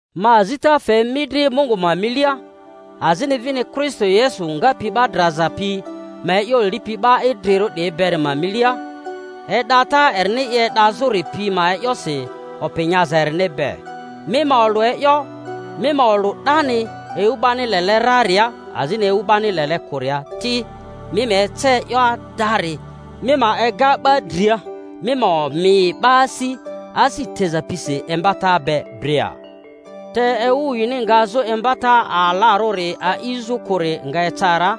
Ma azita fe mi dri Mungu ma milia, azini vini Kristo Yesu ngapi 'ba draza pi ma e'yo lipi 'ba idrirᴜ 'diyi beri ma milia, e'data erini i e'dazᴜri pi ma e'yosi opi nyaza erini be: mi ma olᴜ e'yo, mi ma olᴜ 'dani ewu 'bani lele raria azini ewu 'bani lele kᴜria ti, mi ma ece e'yo adari, mi ma ega 'ba dria, mi ma omi 'ba asi, asi teza pisi imbata be dria. Te ewu yini ngazᴜ imbata alarᴜri a'izᴜ kᴜri nga eca ra,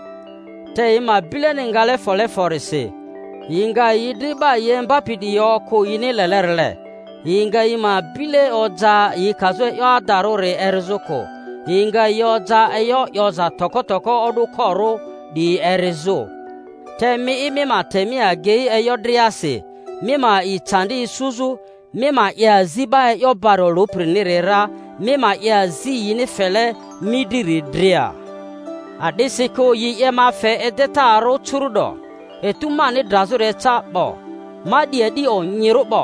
te yi ma bileni ngale fole forisi yi nga yi dri 'ba yi imbapi 'diyi okᴜ yini lelerile, yi nga yi ma bile oja yi kazᴜ e'yo adarᴜri erizᴜ kᴜ, yi nga yi oja e'yo 'yoza toko toko o'dᴜkorᴜ 'diyi erizᴜ. Te mi'i, mi ma te mi agei e'yo driasi, mi ma a'i candi isuzᴜ, mi ma 'ye azi 'ba e'yo bari olᴜpiriniri ra, mi ma 'ye azi yini fele mi driri dria. A'disikᴜ yi 'ye ma fe edetarᴜ curᴜ'do; etu mani drazᴜri eca 'bo Ma 'di a'di onyirᴜri 'bo,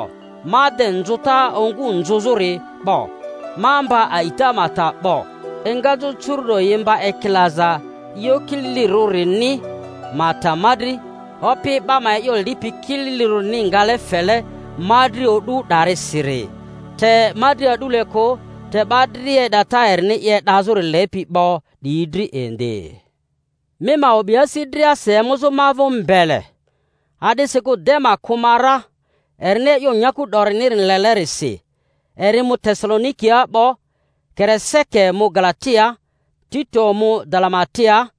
ma de nzᴜta ongu nzᴜzᴜri 'bo, ma mba a'ita ma ta 'bo. Engazᴜ curu’do yi mba ekilaza e'yo kililirᴜrini ma ta ma dri, Opi 'ba ma e'yo lipi kililirᴜ-rini ngale fele ma dri o'du 'darisiri; te ma dri a'dule kᴜ, te 'ba dria e'data erini i e'dazᴜri lepi 'bo 'diyi dri indi. Mi ma o'bi asi driasi emuzᴜ ma vᴜ mbele. A'disikᴜ Dema kᴜ ma ra, erini e'yo nyaku 'dorini lele-risi, eri mu Tesalonikia 'bo; Kere-seke mu Galatiaa, Tito mu Dalama-tiaa.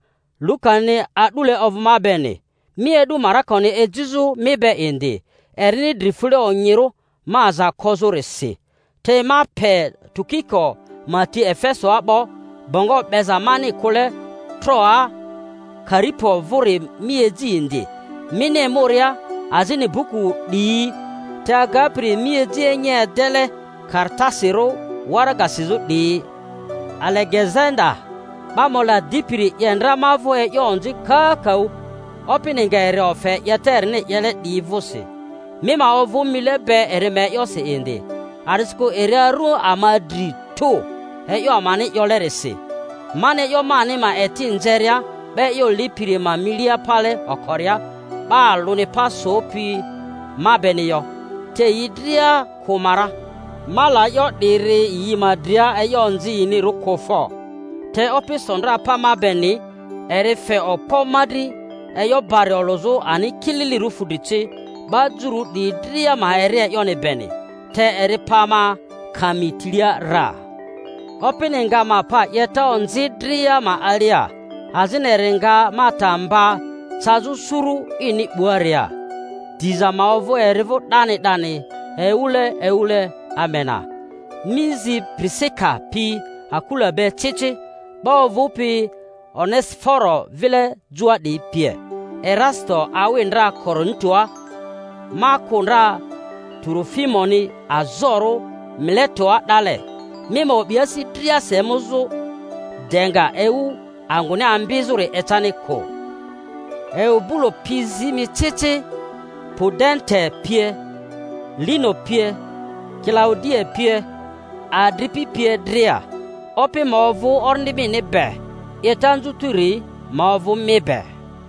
Lukani a'dule ovᴜ ma beni. Mi e'du Marakoni, ejizᴜ mi be indi; erini dri fule onyirᴜ ma aza kozᴜrisi. Te ma pe Tukiko ma ti Efesoa 'bo. Bongo 'beza mani kᴜle Troaa Karipo vᴜri mi eji indi mini emuria, azini buku 'diyi, te agapiri mi eji enyi edele karatasirᴜ waraga sizᴜ 'diyi. Alegezanda 'ba mola dipiri 'ye ndra ma vᴜ e'yo onzi kakaᴜ; Opini nga eri ofe 'yeta erini 'yele 'diyi vᴜsi. Mi ma ovᴜ mile be eri ma e'yosi indi, a'disikᴜ eri aru ama dri tᴜ e'yo amani 'yolerisi. Mani e'yo mani ma eti nzeria 'ba e'yo lipiri ma milia pale okoria, 'ba alᴜni pa sopi ma beni yo; te yi dria kᴜ ma ra. Ma la e'yo 'diri yi ma dria e'yo onzi yinirᴜ kᴜ fo! Te Opi so ndra pa ma beni, eri fe okpo ma dri e'yo bari olᴜzᴜ ani kililirᴜ fudri ci, 'ba Jururᴜ 'diyi dria ma eri e'yoni beni. Te eri pa ma kami tilia ra. Opini nga ma pa 'yeta onzi dria ma alia, azini eri nga ma ta mba cazᴜ suru ini 'buaria. Diza ma ovᴜ eri vᴜ 'dani 'dani ewule ewule. Amena. Mi zi Pirisika pi Akula be ci ci, 'ba ovᴜpi Onesiforo vile joa 'diyi pie. Erasito awi ndra Korintoa; ma kᴜ ndra Turofimoni azorᴜ Miletoa 'dale. Mi ma o'bi asi driasi emuzᴜ de nga ewu anguni ambizᴜri ecani kᴜ. Eubulo pi zi mi ci ci, Pudente pie, Lino pie, Kilaudia pie, adripi pie dria. Opi ma ovᴜ orindi mini be. 'Yeta anzutiri ma ovᴜ mi be.